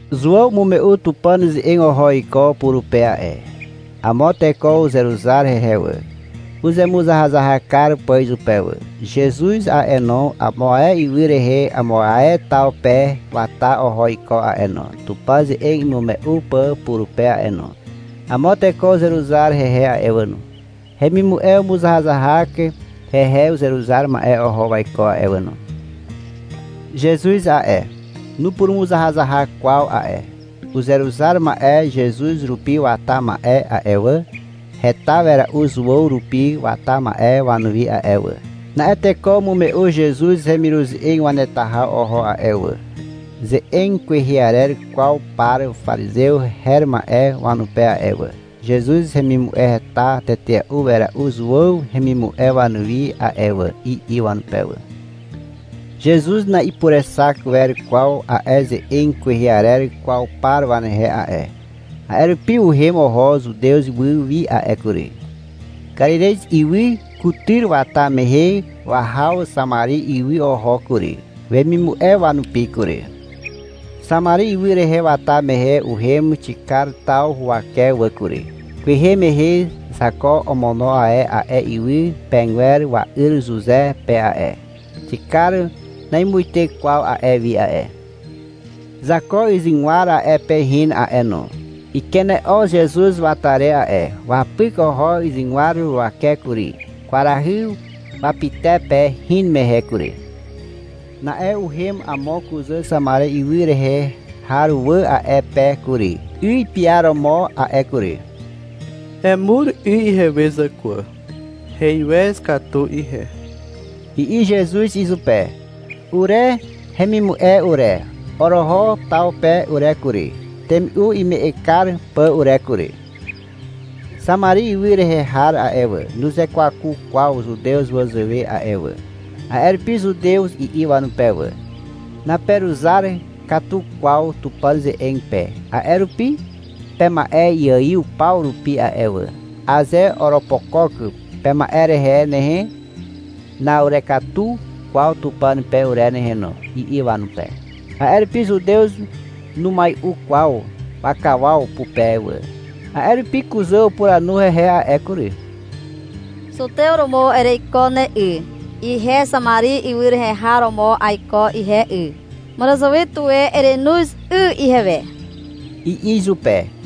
Zuàw umume'u Tupàn ze'eg oho iko purupe a'e. Amo teko uzeruzar hehe wà, uzemuzahazahak kar pà izupe wà. Zezuz a'e no, amo ae ywy rehe amo ae taw pe wata oho iko a'e no, Tupàn ze'eg imume'u pà purupe a'e no. Amo teko uzeruzar hehe a'e wà no. Hemimu'e umuzahazahak hehe uzeruzar ma'e oho waiko a'e wà no. Zezuz a'e, nupurumuzahazahak kwaw a'e. Uzeruzar ma'e Zezuz rupi wata ma'e a'e wà, heta wera'u Zuàw rupi wata ma'e wanuwi a'e wà. Na'e teko umume'u Zezuz hemiruze'eg waneta haw oho a'e wà, ze'eg kwehe arer kwaw par parizew her ma'e wanupe a'e wà. Zezuz hemimu'e heta tetea'u wera'u Zuàw hemimu'e wanuwi a'e wà, i'i wanupe wà. Zezuz na'ipurexak wer kwaw a'e ze'eg kwehe arer kwaw par wanehe a'e. A'e rupi uhem oho Zutez ywy wi a'e kury. Karirez ywy kutyr wata mehe wahaw Xamari ywy oho kury, wemimu'e wanupi kury. Xamari ywy rehe wata mehe uhem Xikar taw huwake wà kury. Kwehe mehe Zako omono e a'e ywy pegwer wa'yr Zuze pe a'e. Xikar namuite kwaw a'e wi a'e. Zako yzygwar a'e pe hin a'e no. Ikene'o Zezuz wata re a'e. Wapyk oho yzygwar huwake kury, kwarahy wapytepe hin mehe kury. Na'e uhem amo kuzà Xamari ywy rehe har wà a'e pe kury, 'y piaromo a'e kury. — Emur 'y ihewe zàkwà, heiwez katu ihe, i'i Zezuz izupe. (Ure hemimu'e ure, oroho taw pe ure kury, temi'u ime'eg kar pà ure kury.) (Xamari ywy rehe har a'e wà, nuzekwaku kwaw Zutew wazàwe a'e wà. A'e rupi Zutew i'i wanupe wà. — Naperuzar katu kwaw Tupàn ze'eg pe, a'e rupi pema'e iaiw paw rupi a'e wà. Aze oropokok pema'e rehe nehe, na'urekatu kwaw Tupàn pe ure nehe no, i'i wanupe. A'e rupi Zutew numai'u kwaw wakawaw pupe wà.) A'e rupi kuzà upuranu hehe a'e kury, — Zutew romo ereiko ne 'y, ihe Xamari ywy rehe har romo aiko ihe 'y, màràzàwe tuwe erenoz 'y ihewe, i'i izupe.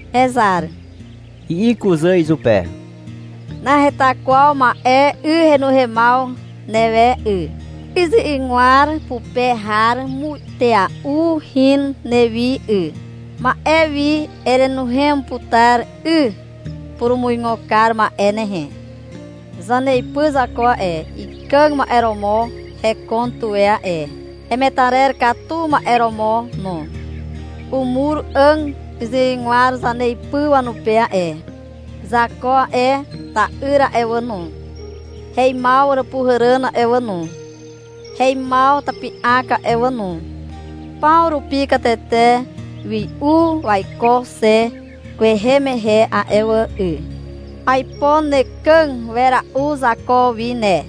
— Hezar, i'i kuzà izupe. — Naheta kwaw ma'e 'y henuhemaw newe 'y. 'Y 'yzygwar pupe har muitea'u hin newi 'y. Ma'e wi erenuhem putar 'y purumuigo kar ma'e nehe. Zaneipy Zako a'e, ikàg ma'e romo hekon tuwe a'e, hemetarer katu ma'e romo no. Umur 'àg 'yzygwar zaneipy wanupe a'e. Zako a'e, ta'yr a'e wà no, heimaw àràpuhàràn a'e wà no, heimaw tapi'ak a'e wà no, paw rupi katete wi'u waiko xe kwehe mehe a'e wà 'y. Aipo nekàg wera'u Zako wi ne.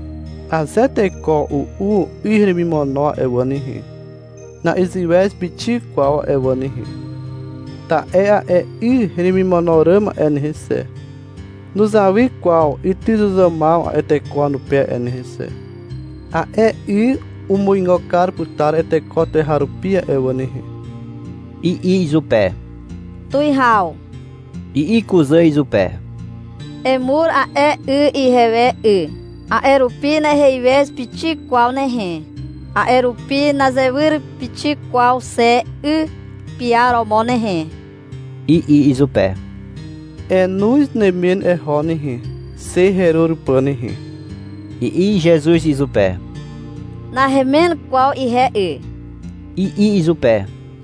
Aze teko u'u 'y heremimono a'e wà nehe, na'iziwez pixik kwaw a'e wà nehe. Ta'e a'e 'y heremimono ràm a'e nehe xe, nuzawy kwaw ytyzuzàmaw a'e teko wanupe a'e nehe xe. A'e 'y umuigo kar putar a'e teko tuweharupi a'e wà nehe, i'i izupe. — Tuwihaw, i'i kuzà izupe. — Emur a'e 'y ihewe 'y. A'e rupi naheiwez pixik kwaw nehe, a'e rupi nazewyr pixik kwaw xe 'y piaromo nehe, i'i izupe. — Enoz nemen eho nehe, xe herur pà nehe, i'i Zezuz izupe. — Nahemen kwaw ihe 'y, i'i izupe.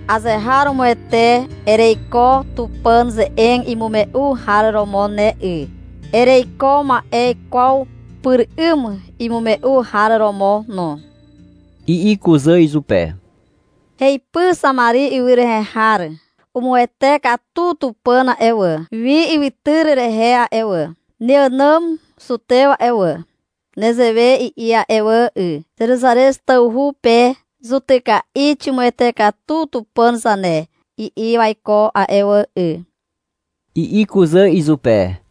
— Azeharomoete ereiko Tupàn ze'eg imume'u har romo ne 'y. Ereiko ma'e ikwaw pyr 'ym imume'u har romo no, i'i kuzà izupe. — Heipy Xamari ywy rehe har, umuwete katu Tupàn a'e wà, wi ywytyr rehe a'e wà. Neànàm Zutew a'e wà, nezewe i'i a'e wà 'y, — Zeruzarez tawhu pe zutyka'i ximuwete katu Tupàn zane, i'i waiko a'e wà 'y, i'i kuzà izupe.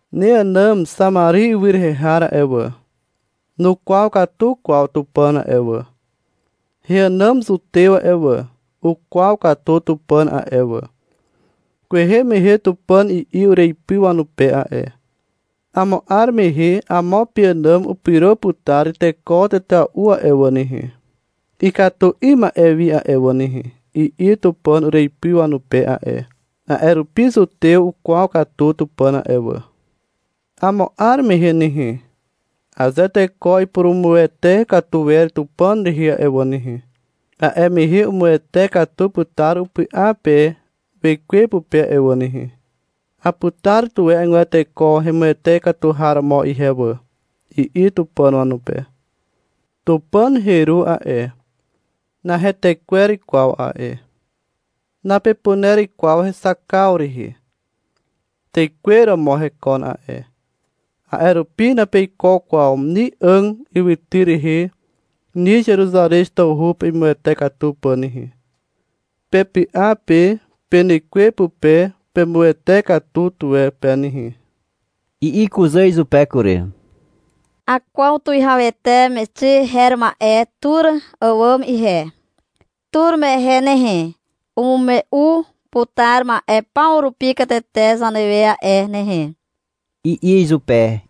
Neànàm Xamari ywy rehe har a'e wà, nukwaw katu kwaw Tupàn a'e wà. Heànàm Zutew a'e wà, ukwaw katu Tupàn a'e wà. Kwehe mehe Tupàn i'i ureipy wanupe a'e. — Amo 'ar mehe amo peànàm upyro putar teko tetea'u a'e wà nehe, ikatu 'ym ma'e wi a'e wà nehe, i'i Tupàn ureipy wanupe a'e. A'e rupi Zutew ukwaw katu Tupàn a'e wà. Amo 'ar mehe nehe, aze teko ipurumuwete katu wer Tupàn rehe a'e wà nehe, a'e mehe umuwete katu putar upy'a pe wekwe pupe a'e wà nehe. — Aputar tuwe agwer teko hemuwete katu har romo ihe wà, i'i Tupàn wanupe. Tupàn heru a'e, nahetekwer kwaw a'e. Napepuner kwaw hexakaw rehe. Tekwe romo hekon a'e. A'e rupi napeiko kwaw ni 'àg ywytyr rehe ni Zeruzarez tawhu pe imuwete katu pà nehe. Pepy'a pe penekwe pupe pemuwete katu tuwe pe nehe. I'i kuzà izupe kury. — Akwaw tuwihawete Mexi her ma'e tur àwàm ihe. Tur mehe nehe, umume'u putar ma'e paw rupi katete zanewe a'e nehe, i'i izupe.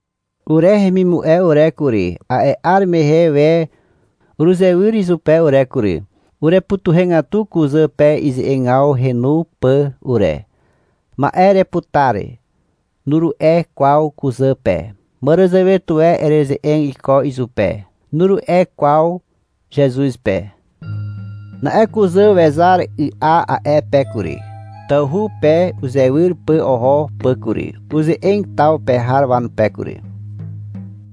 Ure hemimu'e ure kury, a'e 'ar mehe we uruzewyr izupe ure kury. Urepytuhegatu kuzà pe ize'egaw henu pà ure. — Ma'e ereputar, nuru'e kwaw kuzà pe. — Màràzàwe tuwe ereze'eg iko izupe, nuru'e kwaw Zezuz pe. Na'e kuzà wezar y'a a'e pe kury, tawhu pe uzewyr pà oho pà kury. Uze'eg taw pe har wanupe kury.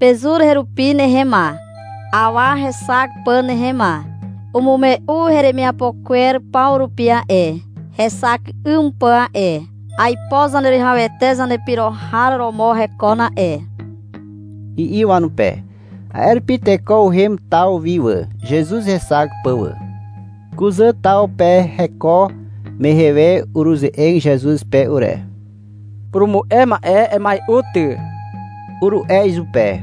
— Pezur herupi nehe ma, awa hexak pà nehe ma. Umume'u heremiapo kwer paw rupi a'e, hexak 'ym pà a'e. Aipo Zaneruwihawete zanepyro har romo hekon a'e, i'i wanupe. A'e rupi teko uhem taw wi wà, Zezuz hexak pà wà. Kuzà taw pe heko mehe we uruze'eg Zezuz pe ure. — Purumu'e ma'e, emai'u ty, uru'e izupe.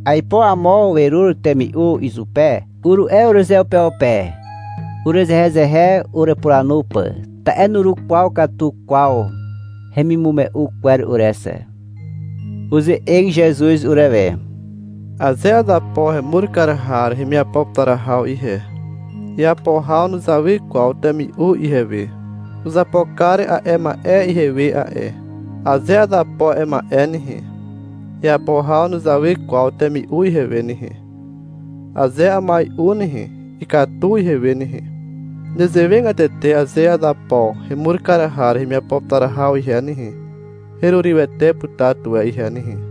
— Aipo amo werur temi'u izupe, uru'e urezeupeupe, urezehezehe urepuranu pà. Ta'e nurukwaw katu kwaw hemimume'u kwer ure xe. Uze'eg Zezuz urewe. — Aze azapo hemur kar har hemiapo putar haw ihe, iapo haw nuzawy kwaw temi'u ihewe. Uzapo kar a'e ma'e ihewe a'e. Aze azapo a'e ma'e nehe, iapo haw nuzawy kwaw temi'u ihewe nehe. Aze amai'u nehe, ikatu ihewe nehe. Nezewegatete aze azapo hemur kar har hemiapo putar haw ihe nehe, herurywete putar tuwe ihe nehe.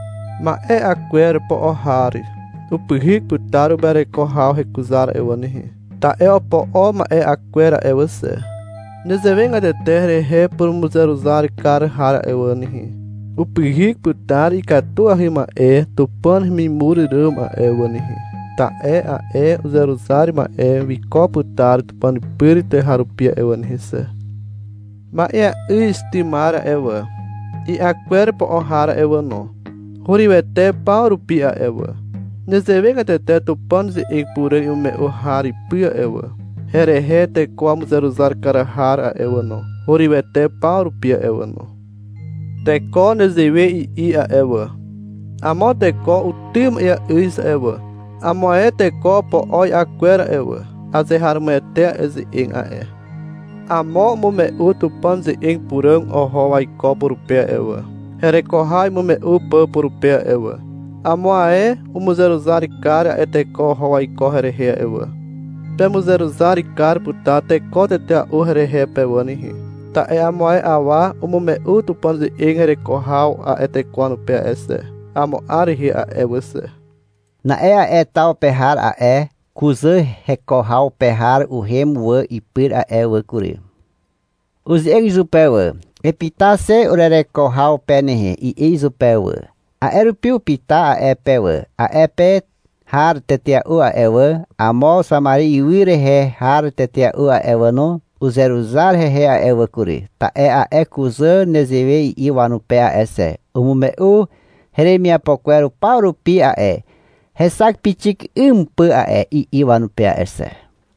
Ma'e 'a kwer po'o har upyhyk putar uma'ereko haw hekuzar a'e wà nehe, ta'e opo'o ma'e 'a kwer a'e wà xe. Nezewegatete herehe purumuzeruzar kar har a'e wà nehe, upyhyk putar ikatuahy ma'e Tupàn hemimur ràm a'e wà nehe, ta'e a'e uzeruzar ma'e wiko putar (Tupàn pyr) tuweharupi a'e wà nehe xe. Ma'eà'yz tymar a'e wà, i'a kwer po'o har a'e wà no, hurywete paw rupi a'e wà. Nezewegatete Tupàn ze'eg puràg imume'u har ipy a'e wà, herehe teko wamuzeruzar kar har a'e wà no, hurywete paw rupi a'e wà no. Teko nezewe i'i a'e wà. — Amo teko utym ma'eà'yz a'e wà, amo ae teko opo'o i'a kwer a'e wà. Azeharomoete a'e ze'eg a'e. Amo umume'u Tupàn ze'eg puràg oho waiko purupe a'e wà, hereko haw imume'u pà purupe a'e wà. Amo ae umuzeruzar kar a'e teko oho waiko herehe a'e wà. Pemuzeruzar kar putar teko tetea'u herehe pe wà nehe, ta'e amo ae awa umume'u Tupàn ze'eg hereko haw a'e teko wanupe a'e wà xe, amo 'ar rehe a'e wà xe. Na'e a'e taw pe har a'e kuzà heko haw pe har uhem wà ipyr a'e wà kury. Uze'eg izupe wà. — Epyta xe urereko haw pe nehe, i'i izupe wà. A'e rupi upyta a'e pe wà. A'e pe har tetea'u a'e wà, amo Xamari ywy rehe har tetea'u a'e wà no, uzeruzar hehe a'e wà kury, ta'e a'e kuzà nezewe i'i wanupe a'e xe, — Umume'u heremiapo kwer paw rupi a'e, hexak pixik 'ym pà a'e, i'i wanupe a'e xe.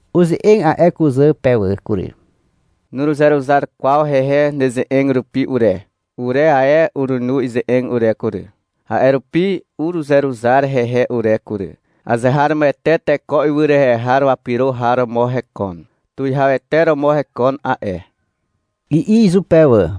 Uze'eg a'e kuzà pe wà kury. — Nuruzeruzar kwaw hehe neze'eg rupi ure. Ure ae urenu ize'eg ure kury. A'e rupi uruzeruzar hehe ure kury. Azeharomoete teko ywy rehe har wapyro har romo hekon. Tuwihawete romo hekon a'e, i'i izupe wà.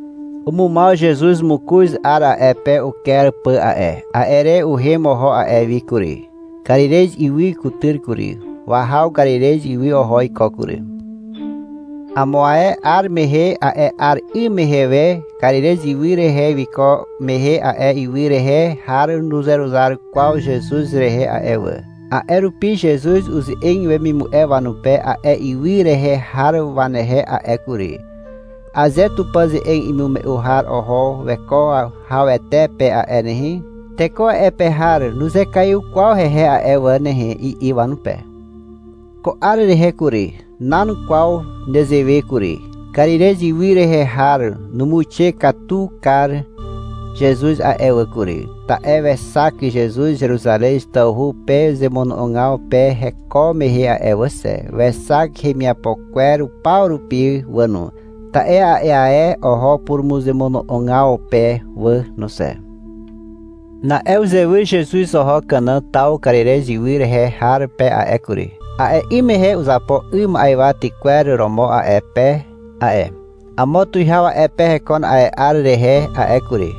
Umumaw Zezuz mokoz 'ar a'e pe uker pà a'e. A'e re uhem oho a'e wi kury, Karirez ywy kutyr kury. Wahaw Karirez ywy oho iko kury. Amo ae 'ar mehe a'e 'ar 'ym mehe we Karirez ywy rehe wiko mehe a'e ywy rehe har nuzeruzar kwaw Zezuz rehe a'e wà. A'e rupi Zezuz uze'eg wemimu'e wanupe a'e ywy rehe har wanehe a'e kury. — Aze Tupàn ze'eg imume'u har oho weko hawete pe a'e nehe, teko a'e pe har nuzekaiw kwaw hehe a'e wà nehe, i'i wanupe. Ko 'ar rehe kury, nan kwaw nezewe kury. Karirez ywy rehe har umuixe katu kar Zezuz a'e wà kury, ta'e wexak Zezuz Zeruzarez tawhu pe zemono'ogaw pe heko mehe a'e wà xe. Wexak hemiapo kwer paw rupi wà no, ta'e a'e ae oho purumuzemono'ogaw pe wà no xe. Na'e uzewyr Zezuz oho Kana taw Karirez ywy rehe har pe a'e kury. A'e 'ym mehe uzapo 'y ma'ywa tykwer romo a'e pe a'e. Amo tuwihaw a'e pe hekon a'e 'ar rehe a'e kury.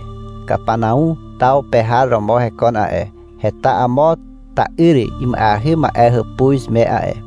Kapanau taw pe har romo hekon a'e. Heta amo ta'yr ima'eahy ma'e hàpuz me a'e.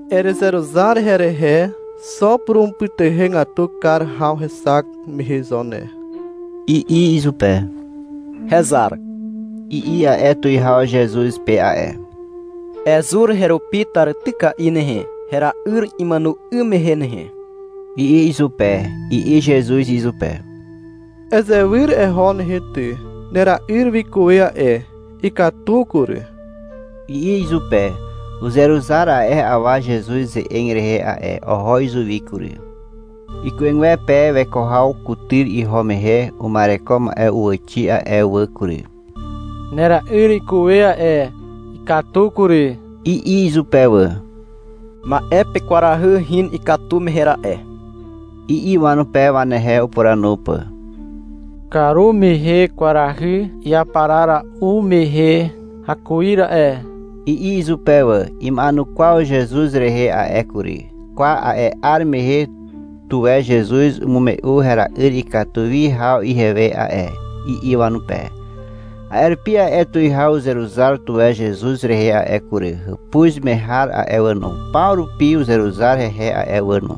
Erezeruzar herehe xo purumupytuhegatu kar haw hexak mehe zo ne, i'i izupe. — Hezar, i'i a'e tuwihaw Zezuz pe a'e. — Ezur herupi tàrityka'i nehe, hera'yr imàno 'ym mehe nehe, i'i izupe. I'i Zezuz izupe. — Ezewyr eho nehe ty, nera'yr wikuwe a'e, ikatu kury, i'i izupe. Uzeruzar a'e awa Zezuz ze'eg rehe a'e. Oho izuwi kury. Iku'egwepe weko haw kutyr iho mehe uma'ereko ma'e uwàxi wà a'e wà kury. — Nera'yr wikuwe a'e, ikatu kury, i'i izupe wà. — Ma'e pe kwarahy hin ikatu mehe ra'e, i'i wanupe, wanehe upuranu pà. — Karumehe kwarahy iaparara'u mehe hakuir a'e, i'i izupe wà. Ima'enukwaw Zezuz rehe a'e kury. — Kwa, a'e 'ar mehe tuwe Zezuz umume'u hera'yr ikatu wi haw ihewe a'e, i'i wanupe. A'e rupi a'e tuwihaw uzeruzar tuwe Zezuz rehe a'e kury. Hàpuz me har a'e wà no, paw rupi uzeruzar hehe a'e wà no.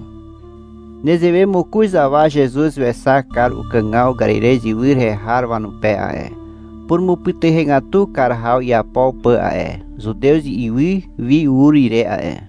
Nezewe mokoz haw Zezuz wexak kar ukàgaw Karirez ywy rehe har wanupe a'e, purumupytuhegatu kar haw iapo pà a'e, Zutez ywy wi ur ire a'e.